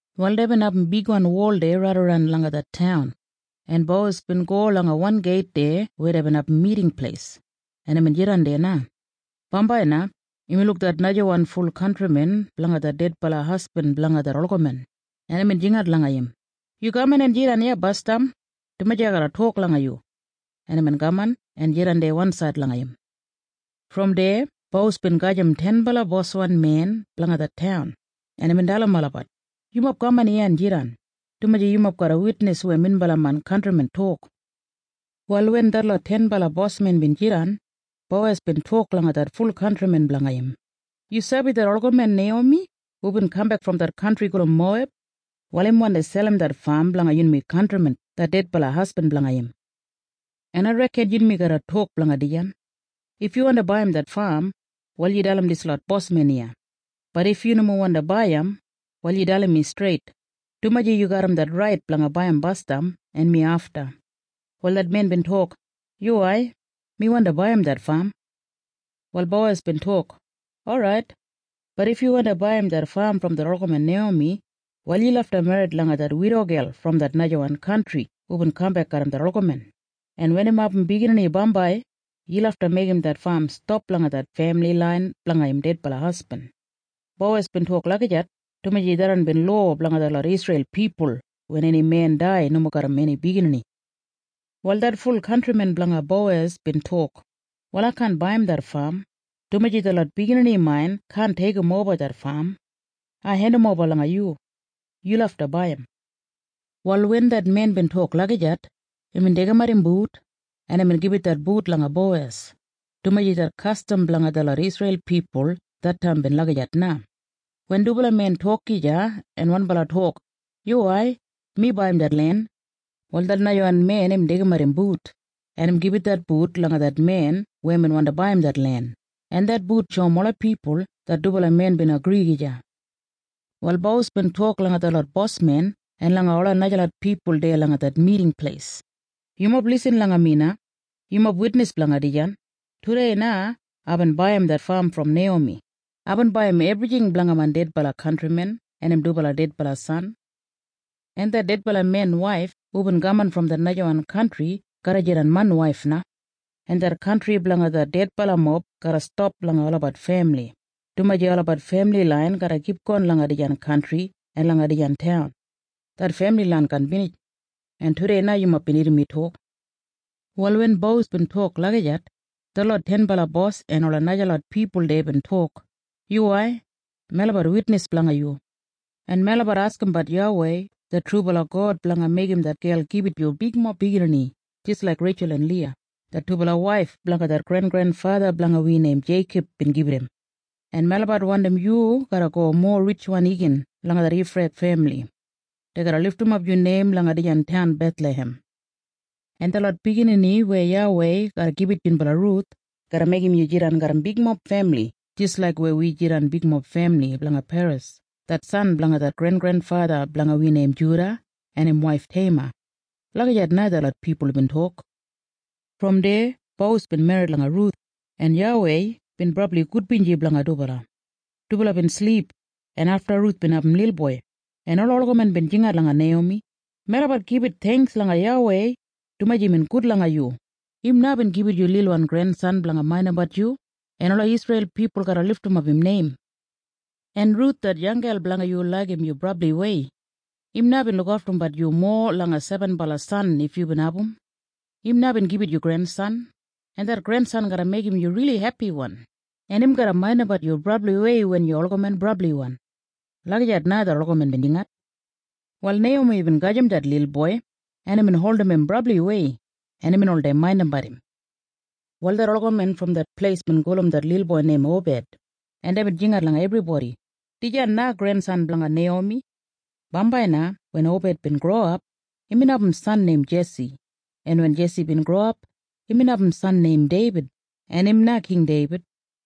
Wal deibin abum bigwan wol deya raidaran langa det taun, en Bowes bin go langa wan geit deya weya deibin abum miting pleis, en imbin jidan deya na. Bambai na imbin luk det najawan ful kantrimen blanga det dedbala hasbin blanga det olgamen, en imbin jingat langa im, “Yu kaman en jidan iya basdam, dumaji ai garra tok langa yu.” En imbin kaman en jidan deya wansaid langa im. Brom deya Bowes bin gajim tenbala boswan men blanga det taun, en imbin dalim olabat, “Yumob kaman iya en jidan, dumaji yumob garra witnis weya minbala main kantrimen tok.” Wal wen detlot tenbala bosmen bin jidan, Bowes bin tok langa det ful kantrimen blanga im, “Yu sabi det olgamen Neiyomi hubin kambek brom det kantri gulum Moweb? Wal im wandi selim det fam blanga yunmi kantrimen det dedbala hasbin blanga im. En ai reken yunmi garra tok blanga dijan. If yu wandi baiyim det fam, wal yu dalim dislot bosmen iya. Bat if yu nomo wandi baiyim, wal yu dalim mi streit, dumaji yu garram det rait blanga baiyim basdam en mi afta.” Wal det men bin tok, “Yuwai. Mi wandi baiyim det fam.” Wal Bowes bin tok, “Orait. Bat if yu wandi baiyim det fam brom det olgamen Neiyomi, wal yu lafta merrit langa det widogel brom det najawan kantri hubin kambek garram det olgamen, en wen im abum biginini bambai, yu lafta meigim det fam stap langa det femili lain blanga im dedbala hasbin.” Bowes bin tok lagijat dumaji tharran bin lowa blanga detlot Isreil pipul wen eni men dai nomo garram eni biginini. Wal det ful kantrimen blanga Bowes bin tok, “Wal ai kaan baiyim det fam, dumaji detlot biginini main kaan deigimoba det fam. Ai hendimoba langa yu. Yu lafta baiyim.” Wal wen det men bin tok lagijat, imbin deigimat im but, en imbin gibit det but langa Bowes, dumaji det kastam blanga detlot Isreil pipul det taim bin lagijat na. Wen dubala men tok gija en wanbala tok, “Yuwai. Mi baiyim det len,” wal det najawan men im deigimat im but, en im gibit det but langa det men weya im wandi baiyim det len, en det but shoum ola pipul det dubala men bin agri gija. Wal Bowes bin tok langa detlot bosmen en langa ola najalot pipul deya langa det miting pleis, “Yumob lisin langa mi na. Yumob witnis blanga dijan. Tudei na aibin baiyim det fam brom Neiyomi. Aibin baiyim ebrijing blanga main dedbala kantrimen en im dubala dedbala san. En det dedbala men waif hubin kaman brom det najawan kantri garra jidan main waif na. En det kantri blanga det dedbalamob garra stap langa olabat femili, dumaji olabat femili lain garra kipgon langa dijan kantri en langa dijan taun. Det femili lain kaan binij. En tudei na yumob bin irrim mi tok.” Wal wen Bowes bin tok lagijat, detlot tenbala bos en ola najalot pipul deya bin tok, “Yuwai. Melabat witnis blanga yu. En melabat askimbat YAWEI det trubala God blanga meigim det gel gibit yu bigmob biginini jis laik Reitjul en Liya, det dubala waif blanga det grengrenfatha blanga wi neim Jeikob bin gibit im. En melabat wandim yu garra go mowa ritjwan igin langa det Efrath femili. Dei garra lidimap yu neim langa dijan taun Bethlahem. En detlot biginini weya YAWEI garra gibit yunbala Ruth garra meigim yu jidan garram bigmob femili jis laik weya wi jidan bigmob femili blanga Peres det san blanga det grengrenfatha blanga wi neim Juda en im waif Teima.” Lagijat na detlot pipul bin tok. Brom deya Bowes bin merrit langa Ruth, en YAWEI bin brabli gudbinji blanga dubala. Dubala bin silip, en afta Ruth bin abum lilboi, en ola olgamen bin jingat langa Neiyomi, “Melabat gibit theingks langa YAWEI, dumaji imbin gud langa yu. Im na bin gibit yu lilwan grensan blanga maindimbat yu, en ola Isreil pipul garra lidimap im neim. En Ruth det yanggel blanga yu laigim yu brabliwei. Im na bin lukaftumbat yu mowa langa sebenbala san if yubin abum. Im na bin gibit yu grensan, en det grensan garra meigim yu rili hepiwan, en im garra maindimbat yu brabliwei wen yu olgamen brabli.” Lagijat na detlot olgamen bin jingat. Wal Neiyomi bin gajim det lilboi, en imbin holdim im brabliwei, en imbin oldei maindimbat im. Wal detlot olgamen brom det pleis bin gulum det lilboi neim Obed, en deibin jingat langa ebribodi, “Dijan na grensan blanga Neiyomi.” Bambai na wen Obed bin growap, imbin abum san neim Jesi, en wen Jesi bin growap, imbin abum san neim Deibid. En im na King Deibid.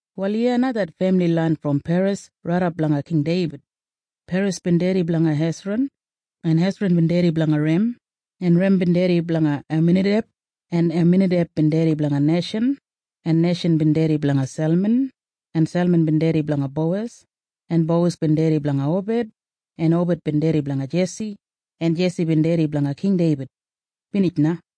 Wal iya na det femili lain brom Peres raidap langa King Deibid. Peres bin dedi blanga Hesran, en Hesran bin dedi blanga Rem, en Rem bin dedi blanga Aminadeb, en Aminadeb bin dedi blanga Neishan, en Neishan bin dedi blanga Selman, en Selman bin dedi blanga Bowes, en Bowes bin dedi blanga Obed, en Obed bin dedi blanga Jesi, en Jesi bin dedi blanga King Deibid. Binij na.